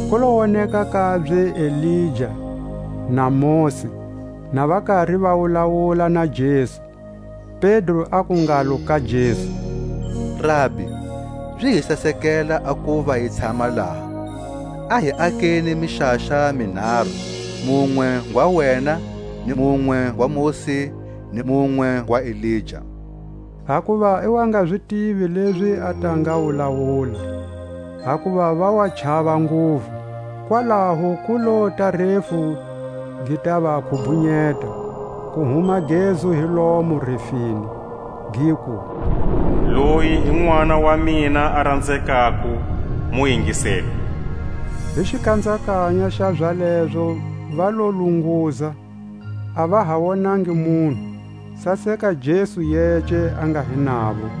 Ku lo woneka kabye Elija na Mosi, na va kari va wulawula na Jesu. Pedro aku ngalo ka Jesu: Rabi, zi hi sasekele a kuva hi tshama laha; a hi akeni mixaxa minharu: munwe ngwa wena, ni munwe ngwa Mosi, ni munwe ngwa Elija; hakuva i wa nga zi tivi lezi a ta nga wulawula, hakuva va wa chava nguvu. Kwalaho ku lota a refu gi ta va khubhunyeta; ku huma gezu hi lomo refini, giku: Loyi hi Nʼwana wa mina a ranzekako, mu ingiseni. Hi xikhanzakanya xa zalezo va lo lunguza, a va ha wonangi munhu, saseka Jesu yece a nga hi navo.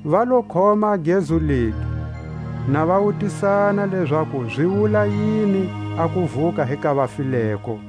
Va lo khoma a gezu legi, na va wutisana lezaku zi wula yini a kuvuka hi ka vafileko.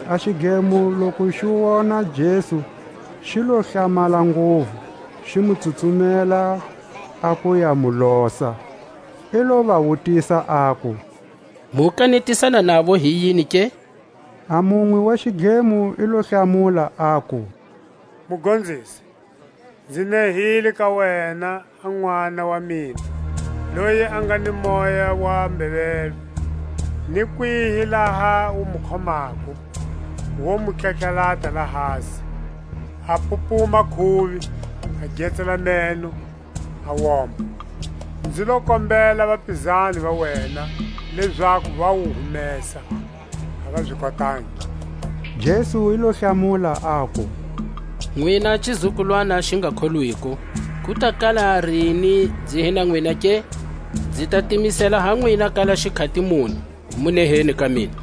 A xidlemo loku xi wona Jesu xi lo hlamala nguvu, xi mu tsutsumela a ku ya mu losa. I lo va wutisa aku: Mu kanetisana navo hi yini ke? A munwe wa xidlemo i lo hlamula, aku: Mugonzisi, nzi nehile ka wena a nʼwana wa mina, loyi a nga ni moya wa mbeveve; ni kwihi laha wu mu khomako, wo mu tlatlalata lahasi; a pupuma khuvi, a getsela meno, a woma. Nzi lo kombela vapizani va wena lezaku va wu humesa, a va zi kotangi. Jesu i lo hlamula, aku: Nwina xizukulwana xi nga kholwiko, ku ta kala rini nzi hi na nwina ke? nzi ta timisela ha nwina kala xikhati muni? Mu neheni ka mina.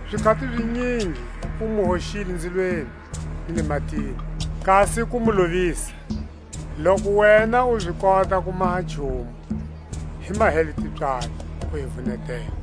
Zikhati zinyingi wu mu hoxile nzilweni ni le matini, kasi ku mu lovisa. Loku wena u zi kota ku maha nchumu, hi mahele tipswalo, u hi vunetela.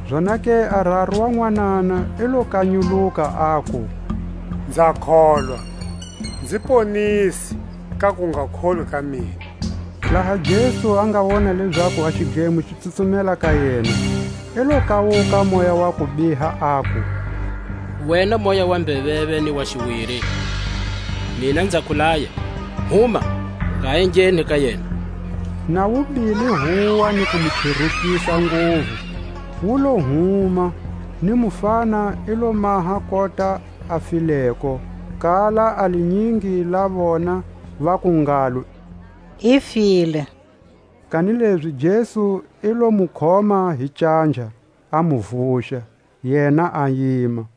Zonake a raru wa nwanana i lo kanyuluka, aku: Nza kholwa; nzi ponise ka kungakholwi ka mina. Laha Jesu a nga wona lezaku a xidlemo xi tsutsumela ka yena, i lo kawuka a moya wa kubiha, aku: Wena moya wa mbeveve ni wa xiwiri, mina nza ku laya, huma, u nga ha engheni ka yena! Na wu bile huwa, ni ku mu cherukisa nguvu, wu lo huma; ni mufana i lo maha kota a fileko, kala a linyingi la vona vaku ngalo: I file. Kanilezi Jesu i lo mu khoma hi canja, a mu vuxa; yena a yima.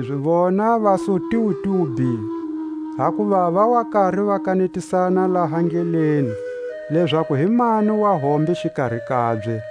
Kanilezi vona va su tiwitiwi bhi; hakuva va wa kari va kanetisana laha ndleleni, lezaku hi mani wahombe xikari kabye.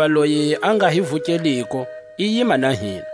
Hakuva loyi a nga hi vukeliko i yima na hina.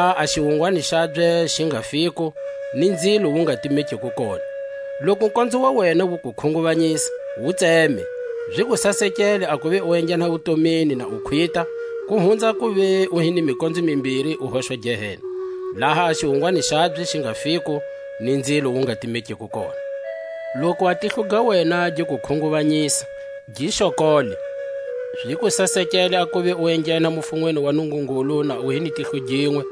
laha a xiwungwani xabye xi nga fiko, ni nzilo wu nga timekiko kona. Loku konzo wa wena wu ku khunguvanyisa, wu tseme; zi ku sasekele a kuva u enghena wutomini na u khwita, ku hunza a kuva u hi ni mikonzo mimbiri, u hoxwa Gehena, laha a xiwungwani xabye xi nga fiko, ni nzilo wu nga timekiko kona. Loku a tihlo ga wena gi ku khunguvanyisa, gi xokole; zi ku sasekele a kuva u enghena mufunweni wa Nungungulu na u hi ni tihlo ginwe,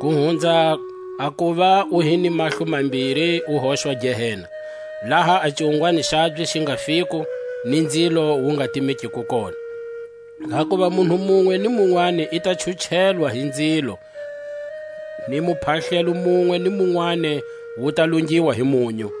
ku hunza a kuva u hi ni mahlo mambiri, u hoxwa Gehena, laha a xiwungwani xabye xi nga fiko, ni nzilo wu nga timekiko kona. Hakuva munhu munwe ni munwani i ta chuchelwa hi nzilo, ni muphahlelo munwe ni munwani wu ta lungiwa hi munyu.